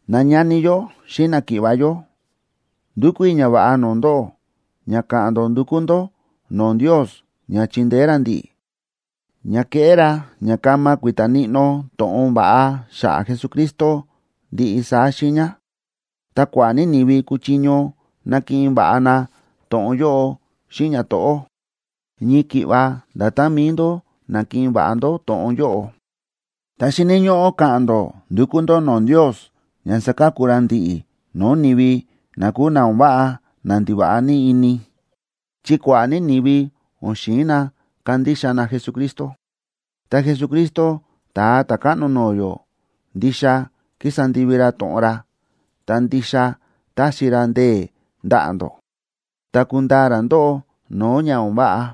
Nañani yó xíꞌin náki̱ꞌva̱ yó, ndúkú i̱ ñava̱ꞌa no̱o̱ ndóꞌó ña ka̱ꞌa̱n ndó ndukú ndó no̱o̱ Ndios ña chindeé ra ndi̱ꞌi̱, ña keꞌé ra ña kama kui̱ta̱ níꞌnó to̱ꞌon va̱ꞌa xa̱ꞌa̱ Jesucristo ndiꞌi saá xiiña, ta kua̱ꞌa̱ ní ni̱vi kuchiño nakiꞌin va̱ꞌa na to̱ꞌon yóꞌo xíꞌin ñato̱ꞌó, ñii ki̱ꞌva nda̱tán mi̱i ndó na̱kiꞌin va̱ꞌa ndó to̱ꞌon yóꞌo. Ta xíni̱ ñóꞌó ka̱ꞌa̱n ndó ndukú ndó no̱o̱ Ndios ña saka̱ku ra ndi̱ꞌi̱ no̱o̱ ni̱vi na kúu na o̱n váꞌa na ndiva̱ꞌa ní ini, chi kua̱ꞌa̱ ní ni̱vi o̱n xi̱in na kandixa na Jesucristo. Ta Jesucristo, Ta̱a Ta̱káꞌno no̱o̱ yó, ndixa kísa ndivi ra to̱ꞌon ra, ta ndixa taxi ra ndee̱ ndaꞌa̱ ndó, ta kundaa ra ndóꞌó no̱o̱ ña o̱n váꞌa.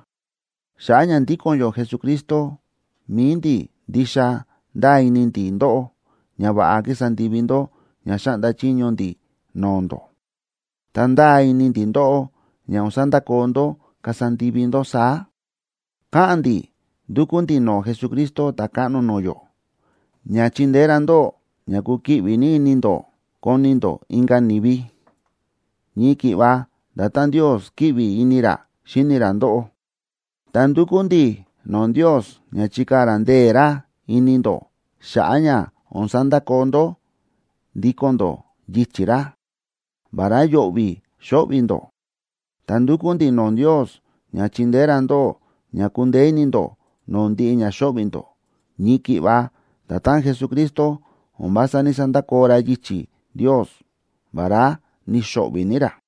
Xa̱ꞌa̱ ña ndíko̱n yó Jesucristo, mi̱i ndi̱ ndixa ndáa ini ndi̱ ndóꞌó ña va̱ꞌa kísa ndivi ndó ña xáꞌnda chiño ndi̱ no̱o̱ ndó. Ta ndáa ini ndi̱ ndóꞌó ña o̱n sandakoo ndó kasa ndivi ndó saá. Káꞌa̱n ndi̱ ndúkú ndi̱ no̱o̱ Jesucristo Ta̱káꞌno no̱o̱ yó, ña chindeé ra ndóꞌó ña kukiꞌvi ní ini ndó koni ndó inka̱ ni̱vi, ñii ki̱ꞌva nda̱tán Ndios kíꞌvi ini ra xíni ra ndóꞌó. Ta ndúkú ndi̱ no̱o̱ Ndios ña chikaa̱ ra ndee̱ ra ini ndó xa̱ꞌa̱ ña o̱n sandakoo ndó ndíko̱n ndó yichi̱ ra, vará yo̱ꞌvi̱ xo̱ꞌvi̱ ndó. Ta ndúkú ndi̱ no̱o̱ Ndios ña chindeé ra ndóꞌó ña kundeé ini ndó no̱o̱ ndiꞌi ña xo̱ꞌvi̱ ndó, ñii ki̱ꞌva nda̱tán Jesucristo o̱n vása ní‑sandakoo ra yichi̱ Ndios, vará ni̱xo̱ꞌvi̱ ní ra.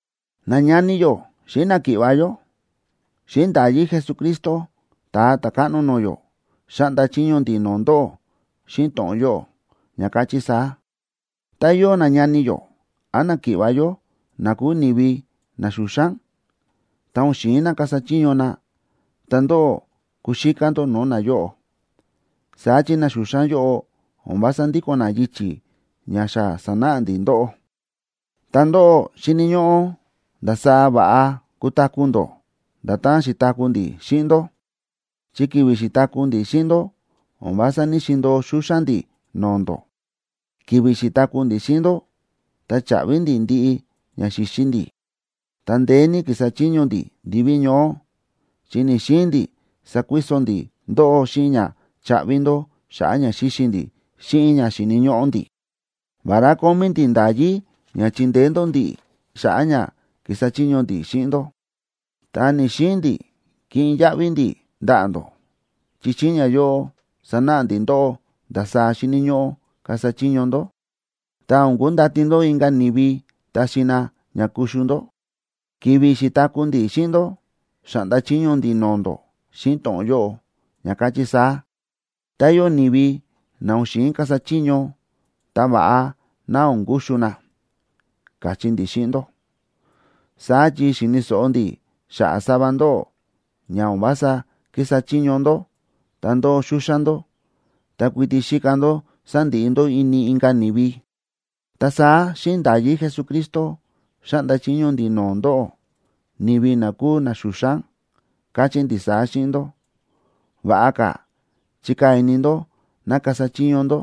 Nañani yó xíꞌin náki̱ꞌva̱ yó, xíꞌin nda̱yí Jesucristo, Ta̱a Ta̱káꞌno no̱o̱ yó, xáꞌnda chiño ndi̱ no̱o̱ ndóꞌó xíꞌin to̱ꞌon yóꞌo, ña káchí saá: Tá yóo nañani yó án náki̱ꞌva̱ yó na kúu ni̱vi na xúxán, ta o̱n xi̱in na kasa chiño na, ta ndóꞌó kuxíká ndó no̱o̱ nayóꞌo. Saá chi na xúxán yóꞌo o̱n vása ndíko̱n na yichi̱ ña xa sa̱náꞌa ndi̱ ndóꞌó. Ta ndóꞌó xíni̱ ndó ndasaá va̱ꞌa kutaku̱ ndó nda̱tán xi̱taku̱ ndi̱ xíꞌin ndó. Chi ki̱vi̱ xi̱taku̱ ndi̱ xíꞌin ndó, o̱n vása ní‑xindo̱o xúxán ndi̱ no̱o̱ ndó. Ki̱vi̱ xi̱taku̱ ndi̱ xíꞌin ndó, ta cha̱ꞌvi ndi̱ ndiꞌi ña xi̱xi ndi̱. Ta ndeé ní ki̱sa chiño ndi̱ ndiví ñoó, chi ni̱‑xiin ndi̱ sakuiso ndi̱ ndóꞌó xíꞌin ña chaꞌvi ndó xa̱ꞌa̱ ña xi̱xi ndi̱ xíꞌin ña xíni̱ ñóꞌó ndi̱. Vará kómí ndi̱ nda̱yí ña chindeé ndó ndi̱ꞌi̱, xa̱ꞌa̱ ña kísa chiño ndi̱ xíꞌin ndó, ta ni̱‑xiin ndi̱ kiꞌin yaꞌvi ndi̱ ndaꞌa̱ ndó, chi xíꞌin ñayóꞌo sánáꞌa ndi̱ ndóꞌó ndasaá xíni̱ ñóꞌó kasa chiño ndó, ta o̱n kundati ndó inka̱ ni̱vi taxi na ña kuxu ndó. Ki̱vi̱ xi̱taku̱ ndi̱ xíꞌin ndó, xa̱ꞌnda chiño ndi̱ no̱o̱ ndó xíꞌin to̱ꞌon yóꞌo, ña káchí saá: tá yóo ni̱vi na o̱n xi̱in kasa chiño, ta va̱ꞌa ná o̱n kuxu na, káchí ndi̱ xíꞌin ndó. Saá chi xi̱ni̱ so̱ꞌo ndi̱ xa̱ꞌa̱ sava ndóꞌó ña o̱n vása kísa chiño ndó, ta ndóo xúxán ndó, ta kuiti xíka ndó sandiꞌi ndó ini inka̱ ni̱vi. Ta saá xíꞌin nda̱yí Jesucristo xáꞌnda chiño ndi̱ no̱o̱ ndóꞌó, ni̱vi na kúu na xúxán. Káchí ndi̱ saá xíꞌin ndó: Va̱ꞌa ka̱ chikaa̱ ini ndó ná kasa chiño ndó,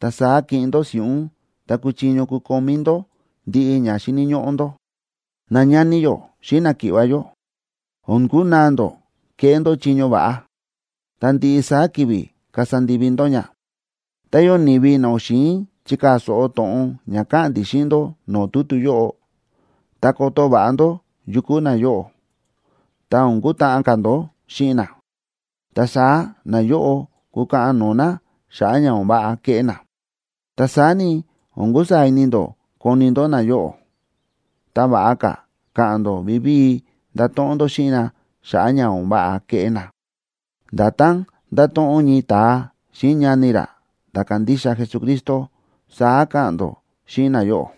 ta saá kiꞌin ndó si̱ꞌún ta kuchiño kukomí ndó ndiꞌi ña xíni̱ ñóꞌó ndó. Nañani yó xíꞌin náki̱ꞌva̱ yó, o̱n kunaa ndó kéꞌé ndó chiño va̱ꞌa, ta ndiꞌi saá ki̱vi̱ kasa ndivi ndó ña. Tá yóo ni̱vi na o̱n xi̱in chikaa̱ so̱ꞌo to̱ꞌon ña káꞌa̱n ndi̱ xíꞌin ndó no̱o̱ tutu yóꞌo, ta koto va̱ꞌa ndó yu kúu nayóꞌo, ta o̱n kutáꞌan ka̱ ndó xíꞌin na. Ta saá nayóꞌo kukaꞌan no̱o̱ na xa̱ꞌa̱ ña o̱n váꞌa ke̱ꞌé na. Ta saá ni, o̱n kusaa̱ ini ndó koni ndó nayóꞌo, ta va̱ꞌa ka̱ ka̱ꞌa̱n ndó vivíi ndato̱ꞌon ndó xíꞌin na xa̱ꞌa̱ ña o̱n váꞌa ke̱ꞌé na. Nda̱tán ndáto̱ꞌon ñii ta̱a xíꞌin ñani ra ta̱ kándixa Jesucristo, saá ka̱ꞌa̱n ndó xíꞌin nayóꞌo.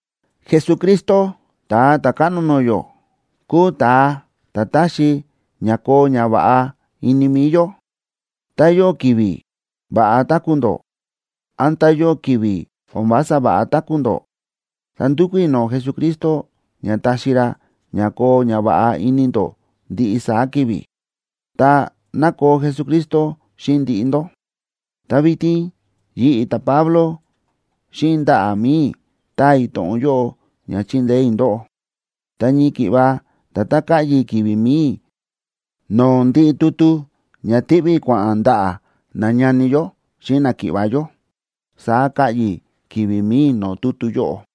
Jesucristo Ta̱a Ta̱káꞌno no̱o̱ yó, kúu ta̱a ta̱ taxi ña koo ñava̱ꞌa ini mi̱i yó. Tá yóo ki̱vi̱ va̱ꞌa táku̱ ndó, án tá yóo ki̱vi̱ o̱n vása va̱ꞌa táku̱ ndó, ta ndúkú i̱ no̱o̱ Jesucristo ña taxi ra ña koo ñava̱ꞌa ini ndó ndiꞌi saá ki̱vi̱. Ta, ¡ná koo Jesucristo xíꞌin ndiꞌi ndó! Ta vitin yi̱ꞌi̱, ta̱Pablo, xíꞌin ndaꞌa̱ mi̱i i̱ táa i̱ to̱ꞌon yóꞌo ña chindeé i̱ ndóꞌó. Ta ñii ki̱ꞌva nda̱tán káꞌyi i̱ ki̱vi̱ mi̱i i̱ no̱o̱ ndiꞌi tutu ña tiꞌví i̱ kua̱ꞌa̱n ndaꞌa̱ nañani yó xíꞌin náki̱ꞌva̱ yó, saá káꞌyi i̱ ki̱vi̱ mi̱i i̱ no̱o̱ tutu yóꞌo.